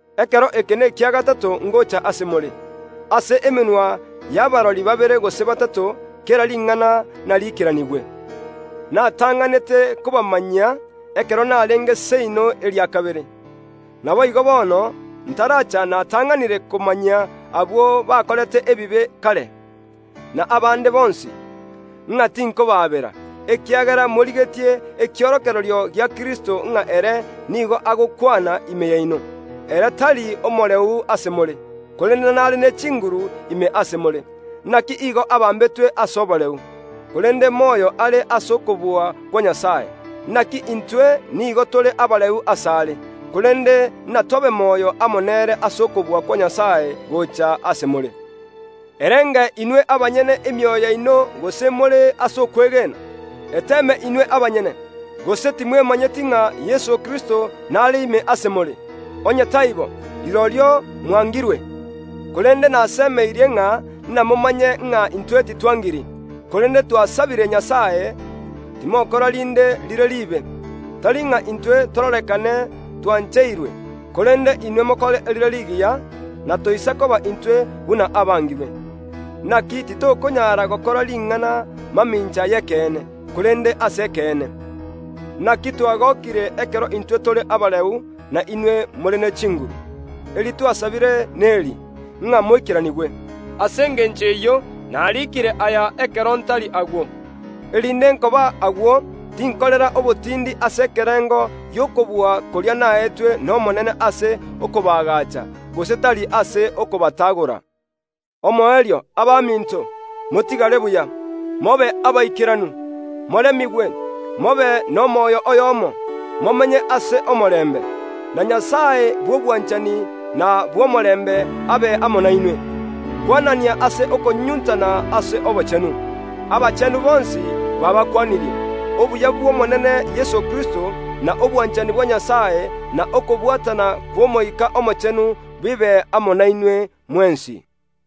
Ekero eke nekia gatato ngocha ase more. Ase emenwa y’abarori babere gose batato kera ring’ana nariikeranigwe. Natang’anete kobamanyia, ekero narenge seino eria kabere, naboigo bono ntaracha natang’anire komanyia abwo bakorete ebibe kare, na abande bonsi, ng’a tinkobaabera, ekiagera morigetie ekiorokererio gia Kristo ng’a ere nigo agokwana ime yaino. Ere tari omoreu ase more, korende nare ne chinguru ime ase more. Naki igo abambetwe ase oboreu, korende moyo are ase okobua kwa Nyasae. Naki intwe nigo tore abareu asare; korende natobe moyo amo nere ase okobua kwa Nyasae gocha ase more. Erenge inwe abanyene emioyo yaino gose more ase okwegena; eteeme inwe abanyene. Gose timwemanyeti ng’a Yeso Kristo nare ime ase more? Onye taibo, rirorio mwangirwe! Korende nasemeirie ng’a namomanye ng’a intwe titwangiri. Korende twasabire Nyasae, timokora rinde rire riibe, tari ng’a intwe tororekane twancheirwe, korende inwe mokore erire rigiya, natoisa koba intwe buna abangirwe. Naki titokonyara gokora ring’ana mamincha y’ekeene, korende ase ekeene. Naki twagokire ekero intwe tore abareu, na inwe more ne chinguru. Eri twasabire neri, ng’a moikeranigwe. Ase engencho eyio nariikire aya ekero ntari agwo, erinde nkoba agwo tinkorera obotindi ase ekerengo gi’okobua koria naetwe n’Omonene ase okobaagacha, gose tari ase okobatagora. Omoerio, abaminto, motigare buya. Mobe abaikeranu, moremigwe, mobe nomoyo oyomo, momenye ase omorembe. Na Nyasae bw’obwanchani na bw’omorembe abe amo nainwe. Kwanania ase okonyunyuntana ase obochenu. Abachenu bonsi baabakwanirie. Obuya bw’Omonene Yeso Kristo, na obwanchani bwa Nyasae na okobwatana kw’Omoika Omochenu bibe amo nainwe mwensi.